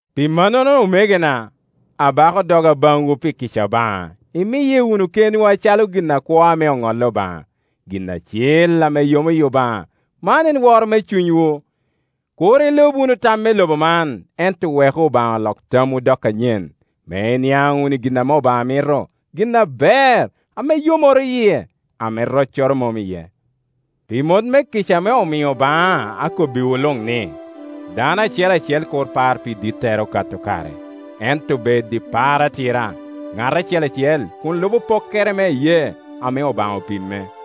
Pi mannono, omegona, abako doga baŋwu pi kica Obaŋa, imiye wunu kenwu acalo gin akwo ame oŋolli Obaŋa, gin acil ame yomo yi Obaŋa; man en woro me cunywu. Kur ilub wunu tam me lobo man, ento weku Obaŋa lok tamwu dok anyen, me iniaŋ wunu i gin ame Obaŋa mito, gin aber, ame yomoro yie, ame roccoro mom iye. Pi mot me kica ame omio baŋa akobbiwu luŋ ni, dano acel acel kur par pi dittere okato kare, ento bed i par atira, ŋat acel acel kun lubo pokkere me iyee ame Obaŋa opimme.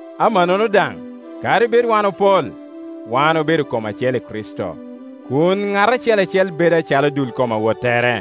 amannono daŋ kadi bed wan opol, wan obedo kom acel i Kricito, kun ŋat acel acel bedo acalo dul kom awottere.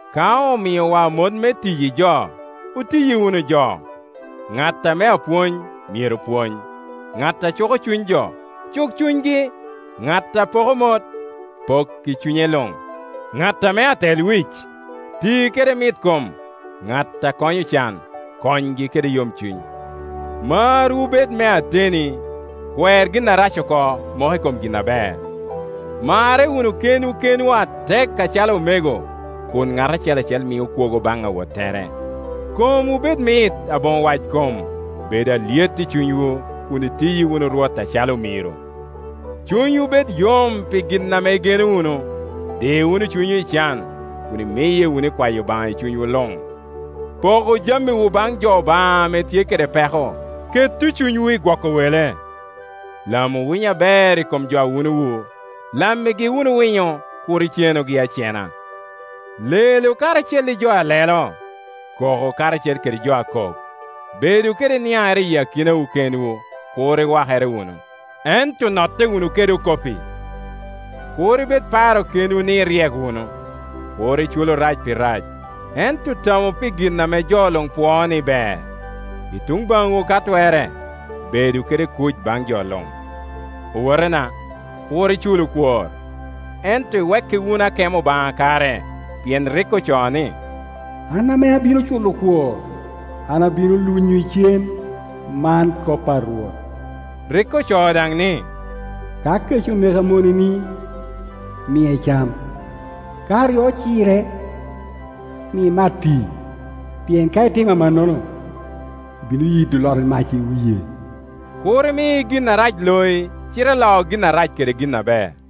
Ka omiowa mot me tiyi jo, otiyi wunu jo. Ŋat ame apwony myero pwony; ŋat a cuko cuny jo, cuk cunygi; ŋat a poko mot, pok i cunye luŋ; ŋat ame atelwic, ti kede mitkom; ŋat a konyo ocan, konygi kede yomcuny. Marwu bed me ateni. Kwer gin arac oko, mok i kom gin aber. Marre wunu kenwu kenwu atek acalo omego, kun ŋat acel acel mio kwogo baŋ awottere. Komwu bed mit, aboŋo wackom, bedu alyet i cunywu; kun itiyi wunu Rwot acalo omiro. Cunywu bed yom pi gin ame igeno wunu; di wunu cunywu i can, kun imiye wunu i kwayo Obaŋa i cunywu luŋ. Poku jamiwu baŋ jo Obaŋa ame tye kede peko; ketu cunywu i gwoko wele. Lamu winyo aber i kom jo a wunowu; lammigi wunu winyo, kur icenugi acena. Lelu karacel i jo a lelo, koku karacel kede jo a kok. Bedu kede niaŋere i akinawu kenwu; kur iwakere wunu, ento notte wunu kede okopi. Kur ibed paro kenwu ni iryek wunu. Kur iculu rac pi rac, ento tamu pi gin ame jo luŋ pwoo ni ber. I tuŋ baŋwu ka twerre, bedu kede kuc baŋ jo luŋ. Owotena, kur iculu kwor, ento iwekki wunu akemo Obaŋa kare, pien rik ocoo ni, “An ame abino culo kwor, an abino lunyo icen, man kop a Rwot.” Rik ocoo daŋ ni, “Ka kec oneko amoneni, mie cam; ka oryo ocire, mie mat pii; pien ka itimo amannono, ibino yido loti mac i wie.” Kur imi gin arac loi, cite lo gin arac kede gin aber.